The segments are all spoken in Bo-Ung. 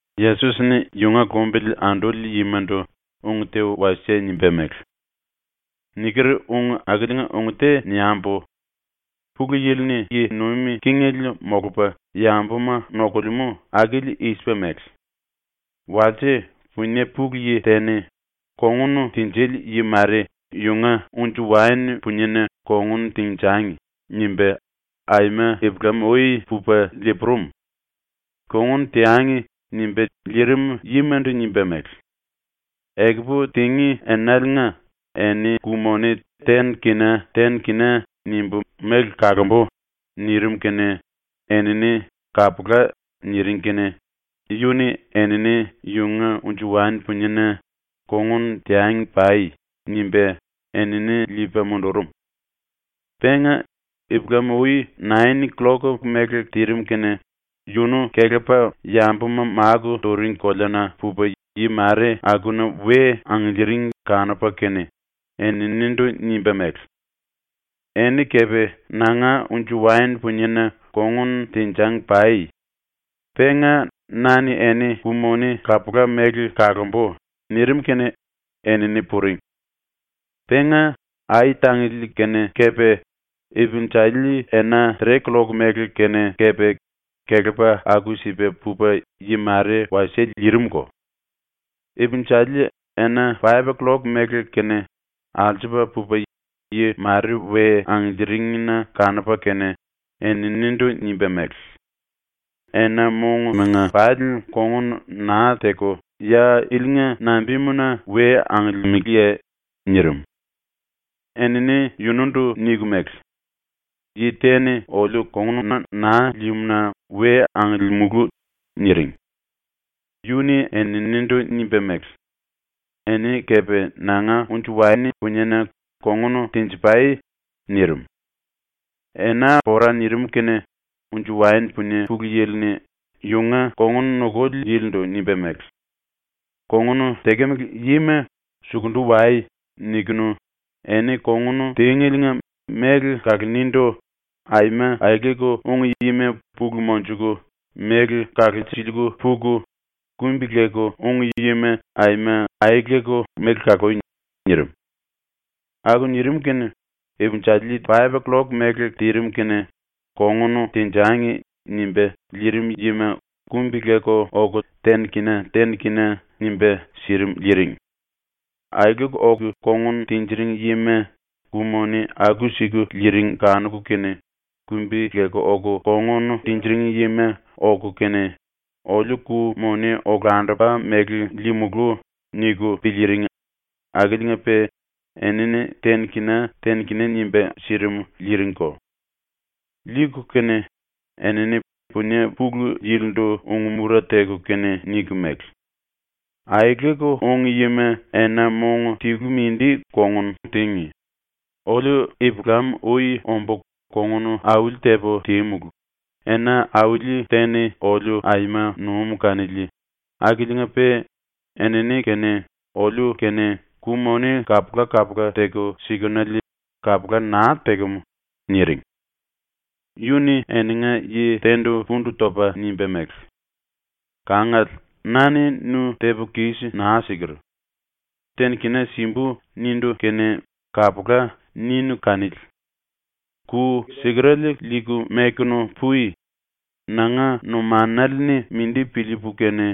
⸤Yesos-ni yunga lumbili anduli yimandu ung te wasie nimba mele:⸥ “Niker ung akiliinga ⸤ung te niambu⸥: Pulu Yili-ni yi nuim kingele molupa yambuma nokulemú akili i-sipa mele: “Walse punie pulu yi te-ni ‘Kongun tinjili yi mare yunga unji-waen puniena kongun tenjangi.’ nimba aima ipulam-ui pupa lii-purum. “Kongun teangi.” nimba liirim yimandu nimba mele: “Ekupu tingí enaliinga eni ku-moni ten kina ten kina nimbu méle kalombu.” nirim kene enini “Kapula.” niring kene yu-ni enini yunga unji-waen puniena “Kongun teangi pai.” nimba enini liipa mundurum. Penga, ipulam-ui nain killok mele tirim kene, yunu kelepa yambuma máku turing koleana pupa yi mare akuna we angiliiring kanupa kene eninindu nimba mele: “Eni kepe ⸤nanga⸥ unji-waen puniena kongun tenjangi pai. Penga na-ni eni ku-moni kapula-mele kalombu.” nirim kene enini puring. Penga ai-tangili kene kepe, ipinjali ena tre-killok mele kene kepe, kelepa aku-sipa pupa yi mare wasie liirimko. Ipinjali ena paip-killok mele kene ⸤alsupa⸥ pupa yi mare we angiliiring-na kanupa kene eninindu nimba mele: “Enaliinga pali kongun naa teku ya ilinga nambimuna we angiliimiliye?” nirim. Enini yunundu niku mele: “Yi te-ni oliu kongununa naa líímu-na we angiliimulu.” niring. Yu-ni eninindu nimba mele: “Eni kepe ⸤nanga⸥ unji-waen puniena kongun tenji-pai.” nirim. Ena pora nirim kene unji-waen punie pulu yili-ni yunga kongun nukuli yilindu nimba mele: “Kongun tekemele yima ‘sukundu wai.’ nikunu eni kongun tíngeliinga méle kalonindu aima aeleku úngi yima pulu monjuku méle kalulsiliiku puku, kumbi-leku úngi yima aima aeleku méle kalui.” nirim. ⸤Aku nirim kene⸥ ipinjali ten killok mele tirim kene “Kongun tenjangi.” nimba liirim yima ⸤kumbi-leku⸥ oku ten-kina ten-kina nimba sirim liiring. Aeleku oku kongun tinjiring yima ku-moni aku-siku liiring kanuku kene kumbi-leku oku kongun tinjiring yima oku kene ‘Oliu ku-moni olandupa mele liimulú.’ niku piliiring akiliinga-pe enini ten-kina ten-kina nimba sirim liiringko. Liiku kene enini punie pulu yilindu ung-mura teku kene niku mele: “Aeleku úngi yima ena-mong tilu mindi kongun tíngi, oliu ipulam-ui ombu kongun auli-tepu tímulu, ena auli te-ni oliu aima num kanili, akiliinga-pe enini kene oliu kene ku-moni kapula-kapula teku sikenele, kapula naa tekem.” niring. Yu-ni eninga yi te-ndu pundu topa nimba mele: “Kangale, na-ni nu tepu kis naa siker. “Ten-kina simbu.” nindu kene “Kapula.” ninu kanili. Ku sikerale liiku mekunu pui. Nanga numanale-ni mindi piliipu kene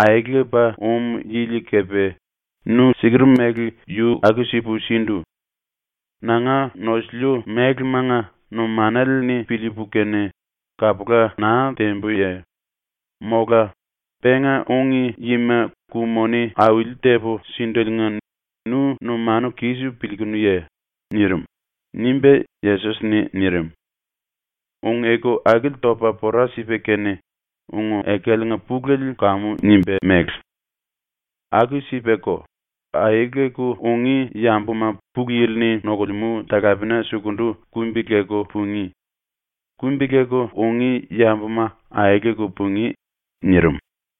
aelepa um yili kepe nu siker mele yu aku-sipu sindu. Nanga nosiliu mélemanga numanale-ni piliipu kene kapula naa tembuye? Mola penga úngi yima ku-moni auli-tepu síndeliinga nu numanu kis piliikunuye?” nirim.” ⸤nimba Yesos-ni nirim.⸥ ⸤Ung-eku akili topa pora sipa kene ung-ekaliinga pulele kamu nimba mele:⸥ “Aku-sipako, aeleku ungí yambuma ⸤Pulu Yili-ni nokulemú talapena sukundu⸥ kumbi-leku pungí; kumbi-leku ungí yambuma aeleku pungí.” nirim.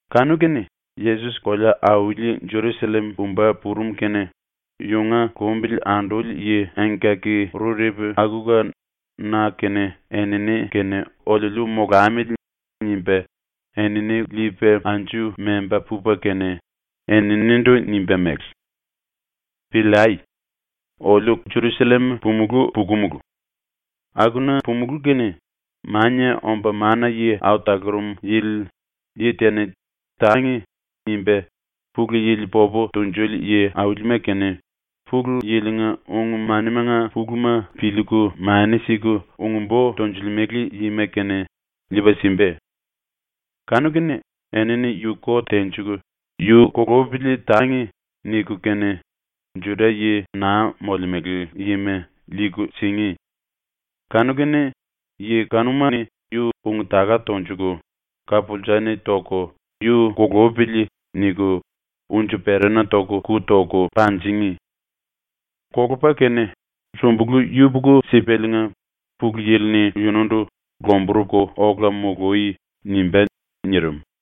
Kanu-kene Yesos kolea-auli Jerusallem pumba purum kene yunga lumbili anduli yi engkaki-rurepu akuka ‘na kene enini kene oliuliu molamili.’ nimba enini liipa anju memba pupa kene eninindu nimba mele: “Piliai. Oliu Jerusallem pumulú pukumulu. Akuna pumulú kene Mania Omba Mana-Yi Au Talurum Yili yi te-ni ‘Tangi.’ nimba Pulu Yili popu tunjuli yi-aulima kene, Pulu Yili-nga ung-manimanga puluma piliiku mani siku ung-bo tonjilimele yima kene, liipa simba. Kanu-kene enini yu kot tenjiku ‘Yu kulupili tangi.’ niku kene Juda-yi naa molemele yima liiku singí. Kanu-kene yi kanuma-ni yu ung-taka tonjuku, ka-pulsa-ni toku, ‘Yu kulupili.’ niku unji-perana ⸤toku⸥ ku toku panjingí. Kolupa kene sumbulu yupuku-sipaliinga Pulu Yili-ni yunundu ‘Lomburuku ola mului.’ nimbá.” nirim.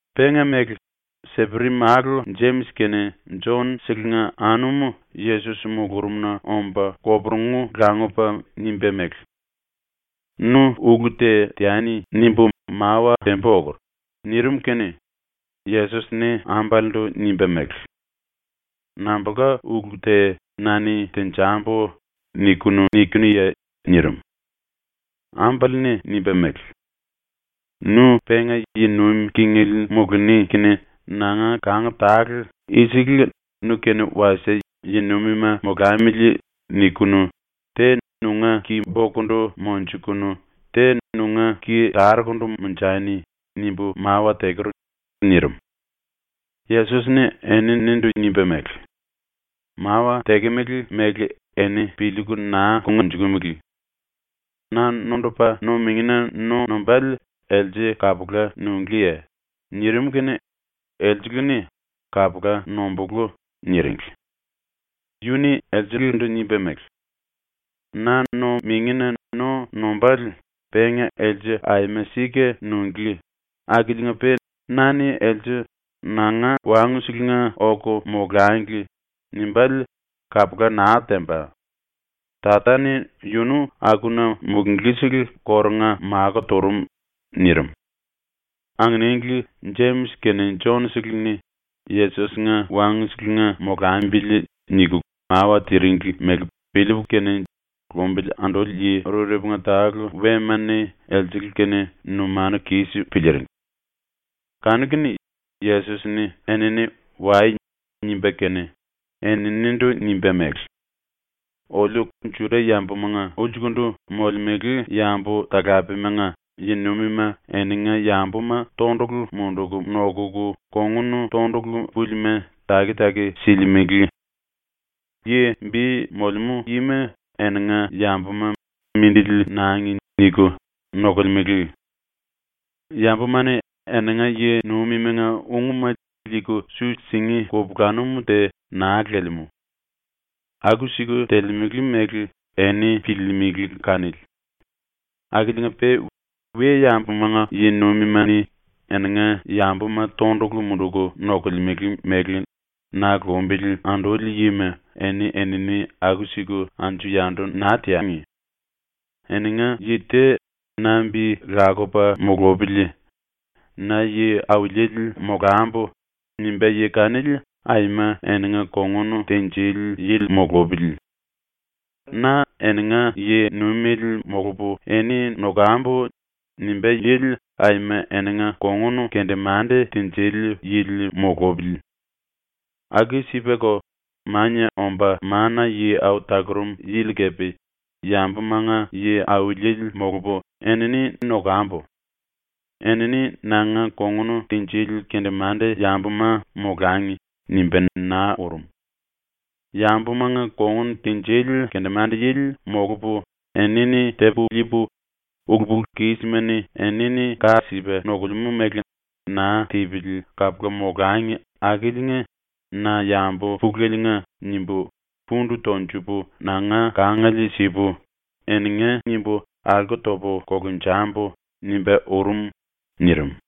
Penga-mele, Seperi-málu Jemis kene Jon-selenga anum Yesos mulurumna omba koporungu langupa nimba mele: “‘Nu ulu te teani.’ nimbu mawa tembu okur.” nirim kene Yesos-ni ambalendu nimba mele: “Nambulka ulu te ‘na-ni tenjambu.’ niku nikinuye?” nirim. Ambale-ni nimba mele: “Nu penga yi nuim kingele muluni kene nanga kang tale ⸤‘i-sele nu-kene wasie yi-nuimima molamili.’ nikunu⸥ ‘te nunga ki-bokundu monjukunu te nunga ki-tarukundu monjani.’ nimbu mawa teker.” nirim. Yesos-ni eninindu nimba mele: “Mawa tekemele mele eni piliiku naa kongnjukumele. Na nondupa no-mingina no nombále else kapula nunglíye?” nirim kene elsele-ni “Kapula nombulú.” niringli. Yu-ni elselendu nimba mele: “Na no-mingina no nombále penga else aima sika nunglí akiliinga-pe na-ni else “Nanga wangu-selenga oku molangli.” nimbále kapula naa temba. Tata-ni yunu akuna mulunglí-sele kórunga makó turum.” nirim. Anginingli ⸤Jemis kene Jon-seleni ‘Yesos-nga wangu-selenga molambili.’⸥ niku mawa tiringli mele piliiku kene lumbili anduli yi rurepunga tale ⸤wema-ni⸥ elsele-kene numanu kis piliiring. Kanu-kene Yesos-ni enini “Wai.” nimba kene, eninindu nimba mele: “Oliu Juda-yambumanga ulsukundu molemele yambu-talapemanga yi-nuimima eninga yambuma tondulu munduku nokuku kongun tondulu púlima taki-taki silimele. Yi bi molemú yima eninga yambuma ‘Mindili nangi.’ niku nokolemele. Yambuma-ni eninga yi-nuimimanga ungma liiku su singí kupulanum te naa lelemú. Aku-siku telemele mele eni piliilimili kanili. Akiliinga-pe ⸤we-yambumanga yi-nuimima-ni eninga yambuma tondulu munduku nokolemele mele na lumbili anduli yima⸥ eni-enini aku-siku anju-yandu naa teangi. Eninga yi te ‘Na bi lakupa mulupili. Na yi-auliele molambu.’ nimbá yi kanili aima eninga kongun tinjili yili mulupili. ‘Na eninga yi-nuimele molupu eni nokambu.’ nimbá yili aima eninga kongun kendemande tinjili yili mulupili. Aku-sipako, Mania Omba Mana-Yi Au Talurum Yili kepe ‘Yambumanga yi-auliele molupu enini nokambu. Enini nanga kongun tinjili kendemande-yambuma molangi.’ nimba naa urum. ‘Yambumanga kongun tinjili kendemande-yili molupu enini tepu liipu, ulu-pulu-kisma-ni enini ka sipa nokulemú mele naa tipili kapula molangi akiliinga na yambu puleliinga nimbu pundu tonjupu nanga kangiele sipu, eninga nimbu alko topu kolunjambu.’ nimba urum.” nirim.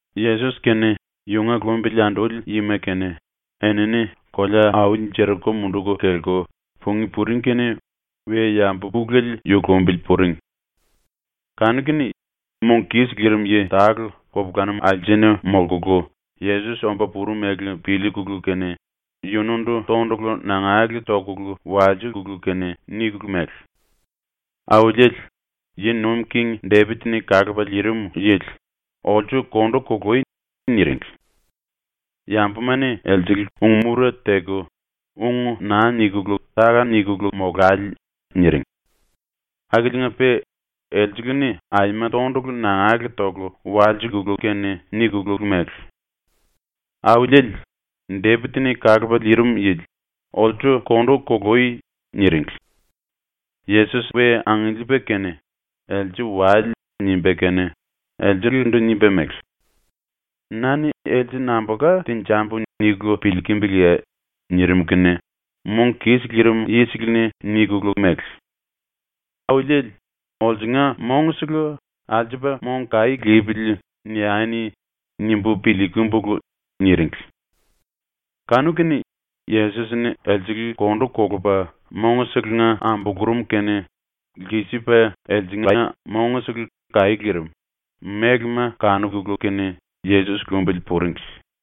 Yesos kene yunga lumbili anduli yima kene enini kolea-auli Jeriko munduku kelku pungí puring kene we-yambu pulele yu lumbili puring. Kanu-kene mong kis lirim yi tale kupulanum alsena molkulu Yesos omba purum mele piliikulu kene yunundu tondulu nangale tokulu walsikulu kene nikulu mele: “Auliele, ⸤Yi Nuim King⸥ Depit-ni Kalupa Liirim Yili, olsu kondu kului.” niringli. Yambuma-ni elsele ung-mura teku “Ung naa nikulu táka-nikulu molale!” niring. Akiliinga-pe elsele-ni aima tondulu nangale toku walsikulu kene nikulu mele: “Auliele, Depit-ni Kalupa Liirim Yili, olsu kondu kului!” niringli. Yesos we angiliipa kene “Else wale.” nimba kene elselendu nimba mele: “Na-ni else nambulka tenjambu niku piliikimbiliye?” nirim kene mong kis lirim yisele-ni nikulu mele: “Auliele, ‘olsunga mongsele ‘Alsupa mong kaí lipili.’ niani.’ nimbu piliikumbulu.” niringli. Kanu-kene Yesos-ni elsele kondu kolupa mongselenga ambulurum kene lkisipa elsengla mongsele kaí lirim, mélema kanukulu kene, Yesos lumbili puringli.